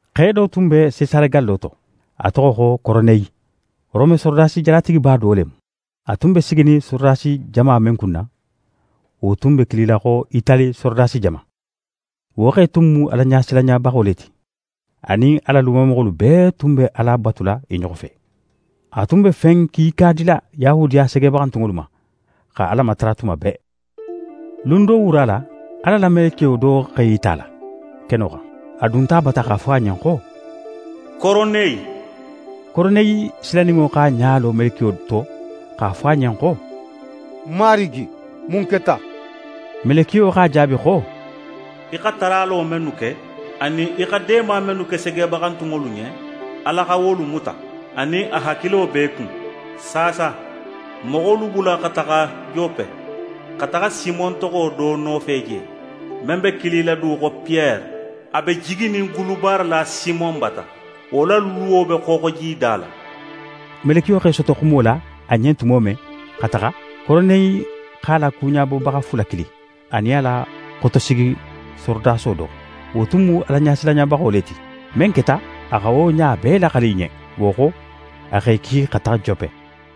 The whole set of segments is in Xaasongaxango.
Xe do tun be Sesare gallo to, a toxo xo Koroneyi. Rome sorodasi jalatigiba do le mu. A tun be siginin sorodasi jama men kunna, wo tun be kilila xo Itali sorodasi jama. Wo xe tun mu Alaɲasilanɲabaxo le ti, a nin a la lumamoxolu bee tunnu be Ala batula i ɲoxo fe. A tun be fen kiika dila Yahudiya segebaxantunŋolu ma, xa Ala matara tuma bee. Lun do wura la, Ala la melekiyo do x'é yita a la, keno xan. A dunta a bata x'a fo a ɲen xo: «Koroneyi!» Koroneyi silaninŋo x'a ɲa lo melekiyo to x'a fo a ɲen xo: «Marigi, mun keta?» Melekiyo x'a jaabi xo: «Í xa taralo mennu ke, anin í xa deema mennu ke segebaxantunŋolu ɲen, Ala xa wolu muta, anin a hakilo be í kun. Saasa, moxolu bula xa taxa Jope, xa taxa Simon toxo do nofe je, men be kilila du xo Piyere. A be jiginin gulubaarala Simon bata, wo la luwo be xooxojida la.» Melekiyo x'é soto xumo la a ɲen tumo men xa taxa, Koroneyi x'a la kuɲabobaxa fula kili, anin a la xotosigi sorodaso do. Wo tun mu Alaɲasilanɲabaxo le ti. Men keta, a xa wo ɲa bee laxali i ɲen. Wo xo, a x'e ki xa taxa Jope.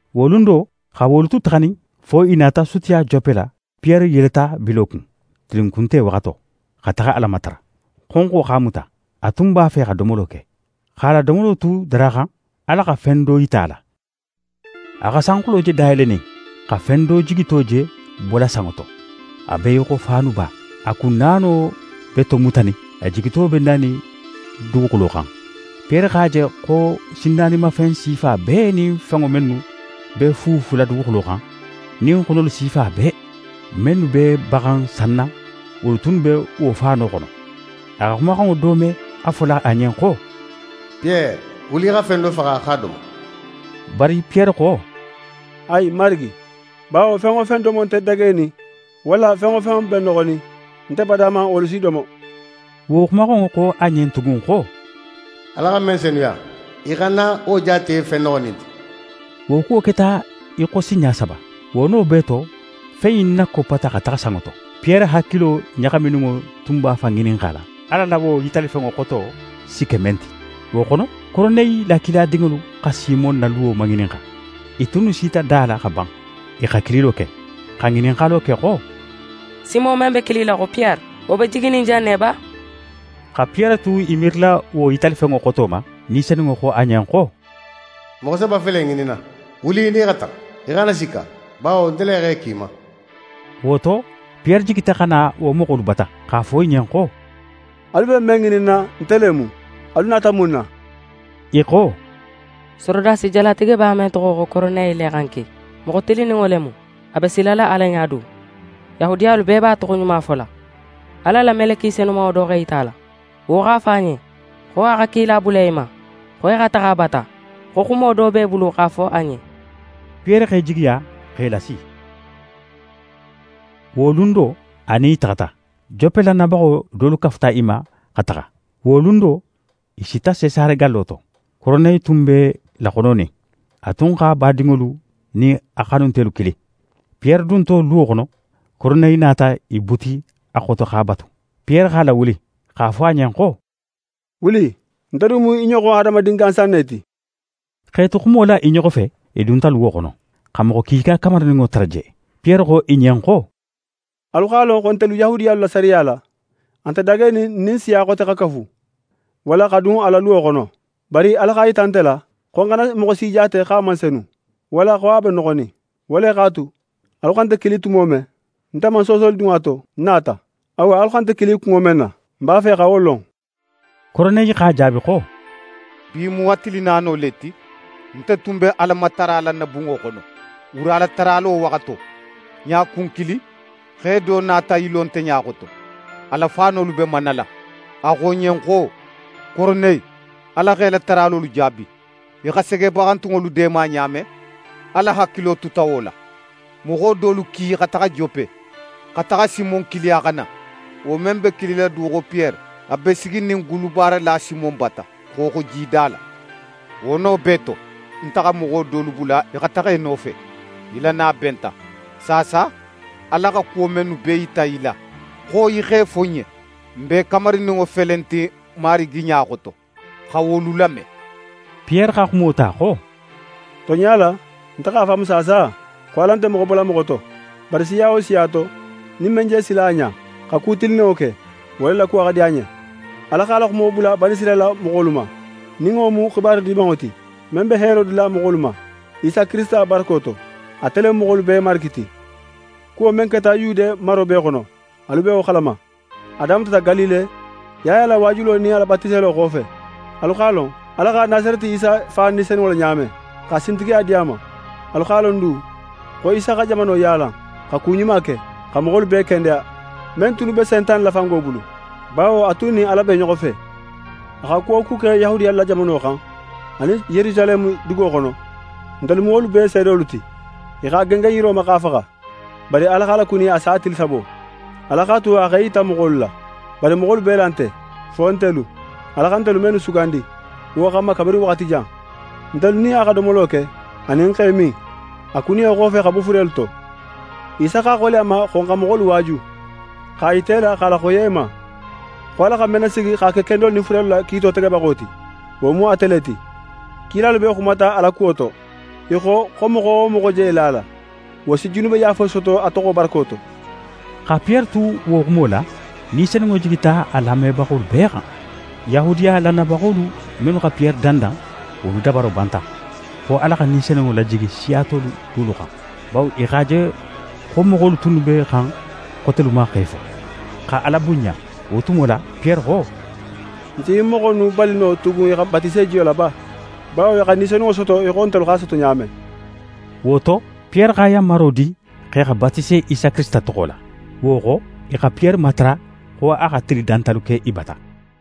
Wo lun do, xa wolu tu taxanin, fo i nata sutiya Jope la, Piyere yeleta bilo kun, tilinkunte waxato, xa taxa Ala matara. Xonxo x'a muta. A tun b'a fe xa domolo ke. X'a la domolo tu daraxan, Ala xa fen do yita a la. A xa sanxulo je dayelenin, xa fen do jigito je bola sanŋo to, a be í xo faanuba. A kun naano be tomutanin, a jigito be nanin duguxulo xan. Piyere x'a je xo sinnaanimafen sifa bee nin fenŋo mennu b'e fuufula duguxulo xan, nin xonolu sifa bee, mennu b'e baxan sanna, wolu tunnu be wo faano xono. A xa xumaxanŋo do me a fola a ɲen xo: «Piyere, wuli í xa fen do faxa x'a domo.» Bari Piyere xo: «Ayi, Marigi! Bawo fen wo fen domo nte dagenin, walla fen wo fen be noxonin, nte bada man wolu si domo.» Wo xumaxanŋo xo a ɲen tugun xo: «Ala xa men senuya, í xana wo jaate fen noxonin ti.» Wo kuwo keta í xo sinɲa saba. Wo no bee to, fen in nakoppata xa taxa sanŋo to. Piyere hakilo ɲaxamininŋo tun b'a fan ŋininxala Ala la wo yitalifenŋo xoto si ke men ti. Wo xono, Koroneyi la kiladinŋolu xa Simon na luwo maŋininxa. I tunnu sita da la xa ban. I xa kililo ke, xa ŋininxalo ke xo: «Simon men be kilila xo Piyere, wo be jiginin jan ne ba?» Xa Piyere tu í miirila wo yitalifenŋo xoto ma, Ni Senunŋo xo a ɲen xo: «Moxo saba fele í ŋininna. Wuli í nin i xa taxa, í xana sikka, bawo nte le x'e ki í ma.» Wo to, Piyere jigita xa na wo moxolu bata, x'a fo i ɲen xo: «Alu be men ŋininna, nte le mu. Alu nata mun na?» I xo: «Sorodasi jalatigiba men toxo xo Koroneyi le xa n ki. Moxo tilinninŋo le mu; a be silala Ala ɲa du. Yahudiyalu bee b'a toxoɲuma fola. Ala la meleke senumanŋo do x'é yita a la, x'a fo a ɲen xo a xa kila bula í ma, xo í xa taxa a bata, xo xumo do b'é bulu x'a fo a ɲen.» Piyere x'e jigiya, x'e lasi. Wo lun do, a nin i taxata. Jope lannayabaxo dolu kafuta i ma, xa taxa. Wo lun do, i sita Sesare gallo to. Koroneyi tun b'e laxononin. A tun x'a badinŋolu nin a xanuntelu kili. Piyere dunto luwo xono, Koroneyi nata í buti a xoto x'a batu. Piyere x'a lawuli, x'a fo a ɲen xo: «Wuli, nte du mu í ɲoxon hadamadin gansan ne ti.» X'e tu xumo la i ɲoxo fe, i dunta luwo xono, xa moxo kiika kamarininŋo tara je. Piyere xo i ɲen xo: «Alu x'a lon xo ntelu Yahudiyalu la sariya la, a nte dagenin n nin siya xote xa kafu, walla xa dun a la luwo xono. Bari Ala x'a yita nte la, xo ń xana moxo si jaate xo a man senu, walla xo a be noxonin. Wo le x'a tu, alu xa nte kili tumo men, nte man soosoli dun a to, ń nata. Awa, alu xa nte kili kunŋo men na, ń b'a fe xa wo lon.» Koroneyi x'a jaabi xo: «Bi mu a tili naano le ti, nte tun be Alamatara la ń na bunŋo xono, wuralataralo waxato. Ɲakun kilin, xe do nata í lo nte ɲa xoto, a la faanolu be manala. A xo ń ɲen xo: “Koroneyi, Ala x'é la taralolu jaabi. Í xa segebaxantunŋolu deema ɲa men, Ala hakilo tuta wo la. Moxo dolu ki i xa taxa Jope, xa taxa Simon kili a xa na, wo men be kilila du xo Piyere. A be siginin gulubaarala Simon bata, xooxojida la.” Wo no bee to, nte xa moxo dolu bula i xa taxa í nofe. Í la na benta. Saasa, Ala xa kuwo mennu bee yita í la xo í x'e fo n ɲen, n bee kamarininŋo fele in ti Marigi ɲa xoto, xa wolu lame.» Piyere xa xumo ta xo: «Tonɲa la, nte x'a faamu saasa xo Ala nte moxo bola moxo to: Bari siya wo siya to, nin men je sila a ɲa, xa ku tilinninŋo ke, wo le la kuwo xa di a ɲen. Ala x'a la xumo bula Banisirayila moxolu ma, nin wo mu xibaru Dimanŋo ti, men be heero dila moxolu ma, Isa Kirisita barako to. Ate le mu moxolu bee Marigi ti. Kuwo men keta Yude maro bee xono, alu be wo xalama. A damutata Galile, Yaya la waajulo nin a la batiselo xofe. Alu x'a lon Ala xa Nasareti Isa fa Ni Senunŋo la ɲa men, xa sintigiya di a ma. Alu x'a lon du xo Isa xa jamano yaala, xa ku ɲuma ke, xa moxolu bee kendeya, men tunnu be Sentane la fango bulu; bawo a tun nin Ala be i ɲoxo fe. A xa ku wo ku ke Yahudiyalu la jamano xan, anin Yerusaleme dugo xono, ntelu mu wolu bee seedolu ti. I x'a gengen yiro ma, x'a faxa. Bari Ala x'a lakuni a sa tili sabo. Ala x'a tu a x'é yita moxolu la. Bari moxolu bee la nte, fo ntelu, Ala xa ntelu mennu sugandi wo xanma kabirin waxati jan. Ntelu nin a xa domolo ke anin x'e min, a kuniyo xofe xa bo furelu to. Isa x'a xoleya n ma xo n xa moxolu waaju, x'a yita i la x'a laxoyiya i ma, xo Ala xa men nasigi x'a ke kendolu nin furelu la kiito tegebaxo ti, wo mu ate le ti. Kilalu bee xumata a la kuwo to. I xo, xo moxo wo moxo je la a la, wo si junubeyaafo soto a toxo barako to.» Xa Piyere tu wo xumo la, Ni Senunŋo jigita a lamebaxolu bee xan. Yahudiya lannayabaxolu mennu xa Piyere dandan, wolu dabaro banta, xo Ala xa Ni Senunŋo lajigi siya tolu dulu xan. Bawo i x'a je xo moxolu tunnu be xan xotelu ma x'e fo, xa Ala bunɲa. Wo tumo la, Piyere xo: «N si ɲin moxo innu bali no tugun i xa batise jiyo la ba; bawo i xa Ni Senunŋo soto í xo ntelu x'a soto ɲa men?» Wo to, Piyere xa yanmaro di x'e xa batise Isa Kirisita toxo la. Wo xo, i xa Piyere matara xo a xa tili dantalu ke i bata.